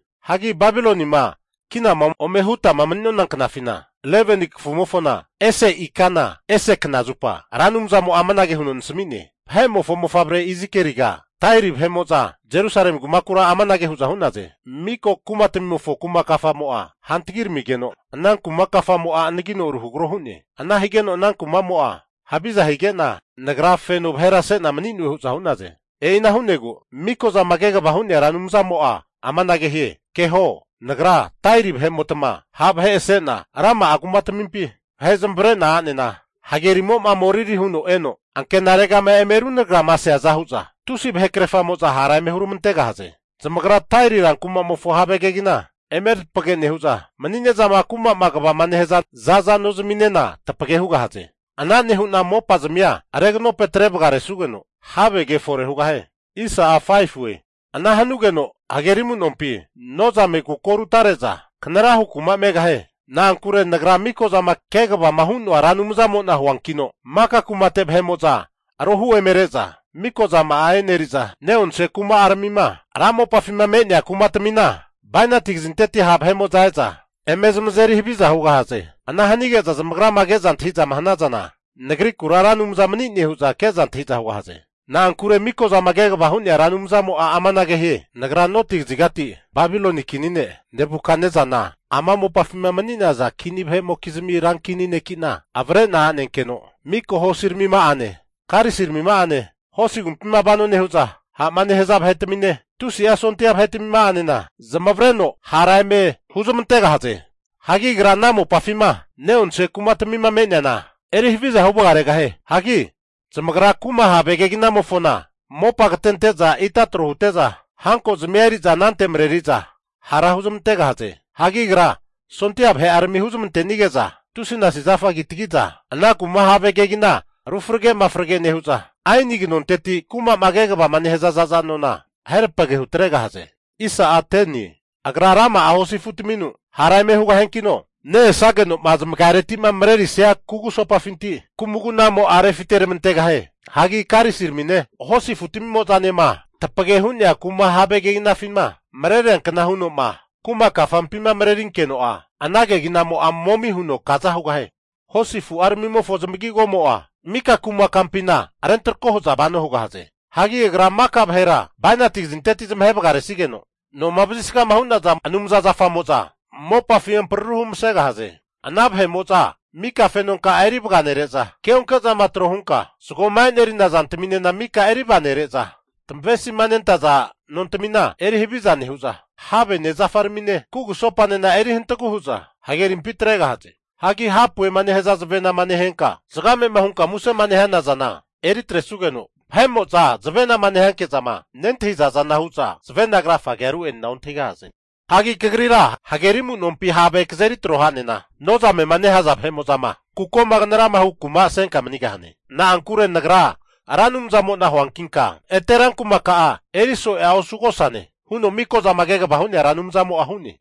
Hagi Babilonima kinama ome hutama mani'nona knafina, 11ni kafumofona ese ikana ese knazupa Ra Anumzamo'a amanage huno nasami'ne. Vahe'mofo mofavre Izikieliga, Tairi vahe'mo'za Jerusalemi vahe kumakura amanage hu'za hu'naze, mika kumatmimofo kuma kafamo'a hantagiramigeno, ana kuma kafamo'a anagino ruhagro hu'ne. Ana higeta ana kuma'mo'a haviza higeta, tagra feno vahera se'ta manune hu'za hu'naze. E'ina hu'nagu Mikozama Kegavama Hu'nea Ra Anumzamo'a amanage hie, Keho, Nagra Tairi vahe'motma ha' vahe ase'na, rama'a kumatmimpi vahe zamavare'na a'nena hagerimo moriri huno eno ankenarega eme runagrama seaza hu'za, tusi vahekrefamo'za hara eme huramantegahaze. Zamagra Tairi rankuma'mofo have kegina eme tapage nehu'za, mani'nezama kuma'ma kegavama nehaza za'za nozminena tapage hugahaze. Ana nehu'na mopazmia reganope atre vagaresugeno havege fore hugahie. Ana hanugeno hageri amu'nompi nozame kuko rutare'za kanarahu kuma megahie. Na'ankure Nagra Mikozama Kegavama Hu'noa Ra Anumzamo'na huankino maka kumate vahe'mo'za arohu eme re'za mika zama'a eneri'za, ne'onse kuma'aramima ra mopafima me'nea kumatamina bainati kazinteti ha' vahe'mo'za e'za eme zamazeri haviza hugahaze. Ana hanage'za zamagrama Nagrikura Ra Anumza mani'ne hu'za keza antahi'za hugahaze. Na'ankure Miko'zama Kegavama Hu'nea Ra Anumzamo'a amanage hie, antahio. Nagra noti kazigati Babiloni kini ne' Nebukatnesana ama mopafima mani'naza kini vahe'mokizmi rankini ne'ki'na avre'na a'nenkeno mika hosiramima'ane, karisiramima'ane, hosi agumpima vano nehu'za ha'ma nehaza vahetamine, tusi'a sondia vahetmima'anena zamavareno esige'za hara eme huzmantegahaze. Hagi agra ana mopafima neonse kumatamima me'neana eri haviza hu vagaregahie. Hagi zamagra kumamofo have keginamofona mopa katente'za ita tro hute'za, hanko'zamia eri'za anante mareri'za hara huzmantegahaze. Hagi agra sondia vahe'arami huzmantenige'za tusinasi zafa kitagi'za ana kuma have kegina rufrage mafrage nehu'za, aeni kanonteti kuma'ma kegavama nehaza za'za nona ahe tapage hutregahaze. Agra rama'a hosi afu'tamimpi maniza hara eme hugahazankino ne-esageno'ma zamagafinti'ma marerisia kugusopafinti kumagunamo'a refite ramantegahie. Hagi karisiramine, hosi afutamimo'zanema, tapage hu'nea kuma have keginafima mareriankna huno'ma kuma kafampima marerinkeno'a, ana keginamo'a momi huno kaza hugahie. Hosi afu'aramimofo zamagigomo'a mika kuma kampina rentrako hu'za vano hugahaze. Hagi agra maka vahera bainati kazinteti zamahe vagaresigeno, noma vazisgama hu'naza anumza zafamo'za mopafi ampararu humasegahie. Ana vahe'mo'za maka fenonka'a eri vaganere'za, keonke zama tro hunka zagoma e'nerina zantaminena maka eri vaganere'za, tamavesima nentaza nontamina eri haviza nehu'za, havene zafaramine, kugusopanena eri hantagu hu'za hagerimpi atregahaze. Hagi hapuema nehaza zavenama nehenka zagame'ma hunka musema nehana zana eri atresugeno, vahe'mo'za zavenama nehanke'zama nentahiza zana hu'za zavena krafagea ru'enena ontahigahaze. Hagi kagrira hageri amu'nompi have kazeri tro ha'nena, nozame'ma nehaza vahe'mo'za kukoma knarama hu kumasenka manigahane. Na'ankure Nagra Ra Anumzamo'na huankinka ete rankumaka'a eriso'ea osugosane huno Mikozama Kegavama Hu'nea Ra Anumzamo'a hu'ne.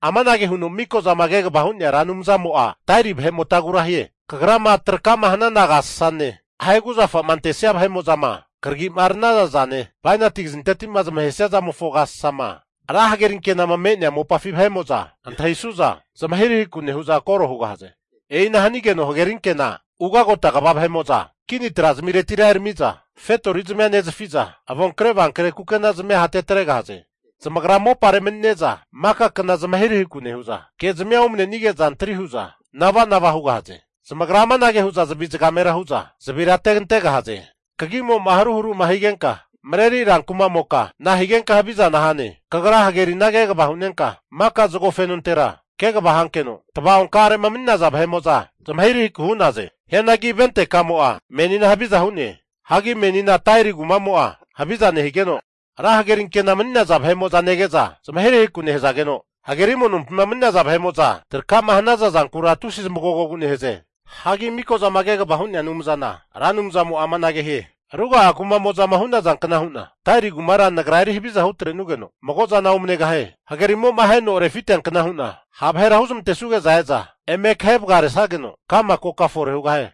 Amanage huno Mikozama Kegavama Hu'nea Ra Anumzamo'a Tairi vahe'motagura hie, Kagrama traka'ma hana agasasane, ahe kuzafa'ma antesia vahe'mo'zama kragi'ma ranaza zane, bainati kazinteti'ma zamahesia zamofo agasasama ra hagerinkenama me'nea mopafi vahe'mo'za antahisu'za zmahirahiku nehu'za koro hugahaze. E'ina hanigeno hageri anke'na nemaniza ugagota kva vahe'mo'za kini tra zamiretira erami'za kini fetori zamia nezafi'za, avonkre avankre kukenazimia hatetregahaze. Zamagra mopare mani'neza maka kna zamahirahikura nehu'za, kezmia omanenige'za antri hu'za nava'nava hugahaze. Zamagra amanage hu'za zavi zagamera hu'za zavira ategantegahaze. Kagimo'ma haruharuma higenka marerisa ranku'mamoka, nahigenka havizana hane. Kagra hagerina kegava hunenka, maka zago fenontera kegava hankeno tava'onka'are'ma mani'naza vahe'mo'za zamahirahiku hu'naze. Hianagi ventekamo'a menina haviza hu'ne. Hagi menina Tairi kuma'mo'a haviza nehigeno, ra hagerinkena mani'naza vahe'mo'za nege'za zmahirahiku nehazageno, hageri amunompima mani'naza vahe'mo'za traka'ma hana zankura tusi zamagogogu nehaze. Hagi Mikozama Kegava Hu'nea Anumzana Ra Anumzamo'a amanage hie, ruga'a kumamo'zama hu'nazankna hu'na, Tairi kumara Nagra eri haviza hu atrenugeno mago'zana omanegahie. Hagerimo'ma aheno refiteankna hu'na ha' vahera huzmantesuge'za eme kahe vagaresageno ka'ma koka fore hugahie.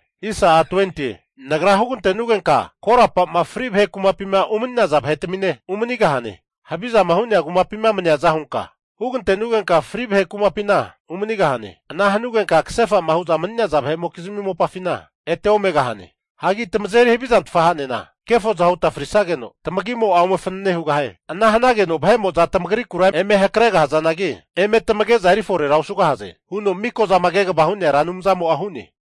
Nagra hugante'nugenka korapama fri vahe kumapima umani'naza vahetamine umanigahane. Havizama hu'nea kumapima maniaza hunka hugante'nugenka, fri vahe kumapina umanigahane. Ana hanugenka kasefa'ma hu'za mani'naza vahe'mokizmi mopafina ete omegahane. Hagi tamazeri havizantfa hanena, kefoza huta frisageno tamagimo'a ome fanane hugahie. Ana hanageno vahe'mo'za tamagrikura eme hakregahazanagi, eme tamage'za eri forera osugahaze huno Mikozama Kegavama Hu'nea Ra Anumzamo'a hu'ne.